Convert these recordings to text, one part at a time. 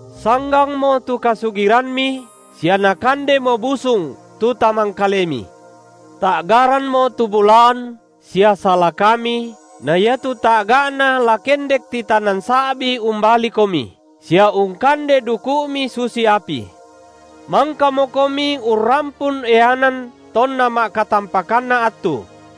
Sanggangmo tu kasugirammi sia nakandemo busung tu tamangkalemi. Ta’garammo tu bulaan sia salakami na iatu ta’ga’na la kendek titanan sa’bi umbalikomi, sia ungkande duku’mi susi api. Mangkamokomi urrampun eanan tonna ma’katampakanna attu.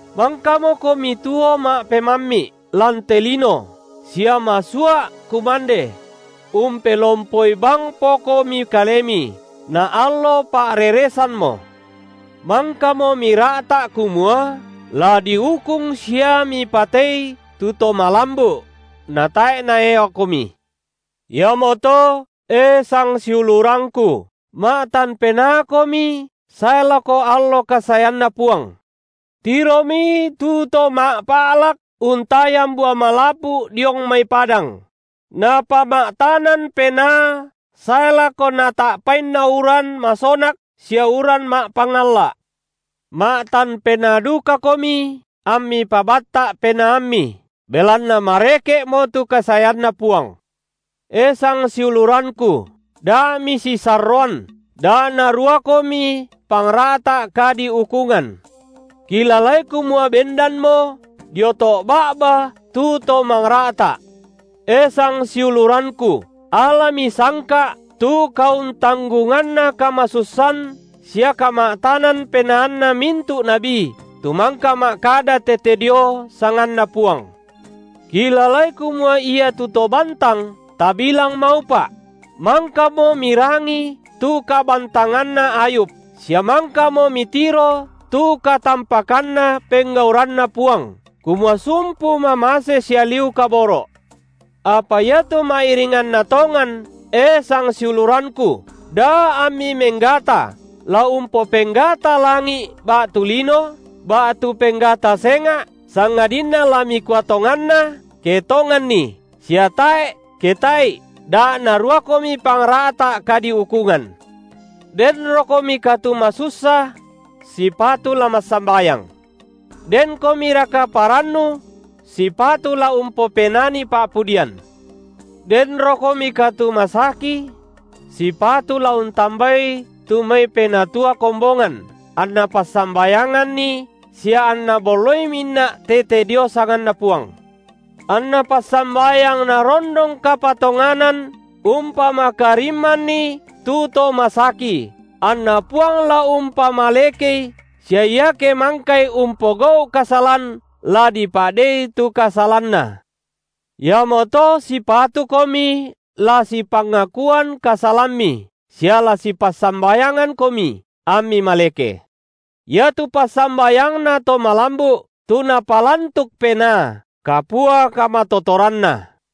Mangkamokomi tuo ma’pemammi’ lan te lino, sia masua’ kumande; umpelompoi bangpokomi kalemi, naallo pa’reresammo. Mangkamo mira’ta’ kumua la diukung sia mipatei tu to malambu’; natae’ naeakomi. Iamoto, e sangiulurangku, ma’tan penaakomi sae lako allo kasaeanNa Puang. Tiromi, tu to ma’pa’lak untayan bua malapu’ diong mai padang; napama’tanan penaa sae lako nata’painna uran masonak sia uran ma’pangalla’. Ma’tan penaa dukakomi ammi pabatta’ penaammi, belanna mareke’mo tu kasaeanNa Puang. E sangsiulurangku, da misisarroan, da naruakomi pangra’ta’ kadiukungan. Kilalai kumua bendanmo dio to’ ba’ba tu To mangra’ta’. E sangsiulurangku, alami sangka’ tu kauntanggunganna kamasussan sia kama’tanan penaanna mintu’ nabi tu mangka ma’kada tete dio sanganNa Puang. Kilalai kumua iatu to bantang, tabilang maupa’; mangkamo mirangi tu kabantanganna Ayub, sia mangkamo mitiro tu katampakanna penggauranNa Puang, kumua sumpu mamase sia liu kaboro’. Apa iatu ma’iringanna tongan, e sangsiulurangku, da ammi menggata, la umpopenggata langi’ ba’tu lino, ba’tu penggata senga’, sangadinna la mikua tonganna, ke tonganni, sia tae’, ke tae’i, da naruakomi pangra’ta kadiukungan. Denrokomika tu masussa? sipatu la massambayang. Denkomiraka parannu? sipatu la umpopenani pa’pudian. Denrokomika tu masaki? sipatu la untambai tu mai penatua kombongan, anna passambayanganni, sia anna bolloi minnak tete dio sanganNa Puang. Anna passambayang narondong kapatonganan umpamakarimmanni tu to masaki, anna Puang la umpamalekei, sia iake mangkai umpogau’ kasalan, la dipa’dei tu kasalanna. Iamoto sipatukomi la sipangakuan kasalammi sia la sipassambayangankomi, ammi maleke. Iatu passambayangna to malambu’, tu napalantuk penaa, kapua kamatotoranna.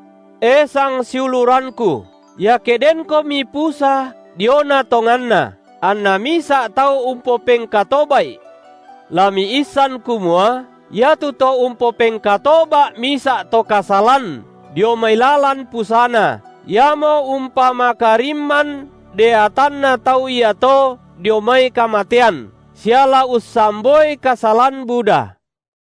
E sangsiulurangku, iake denkomi pusa diona tonganna, anna misa’ tau umpopengkatoba’i, la miissan kumua iatu to umpopengkatoba’ misa’ to kasalan dio mai lalan pusana, iamo umpamakarimman deatanna tau iato dio mai kamatean, sia la ussamboi kasalan buda.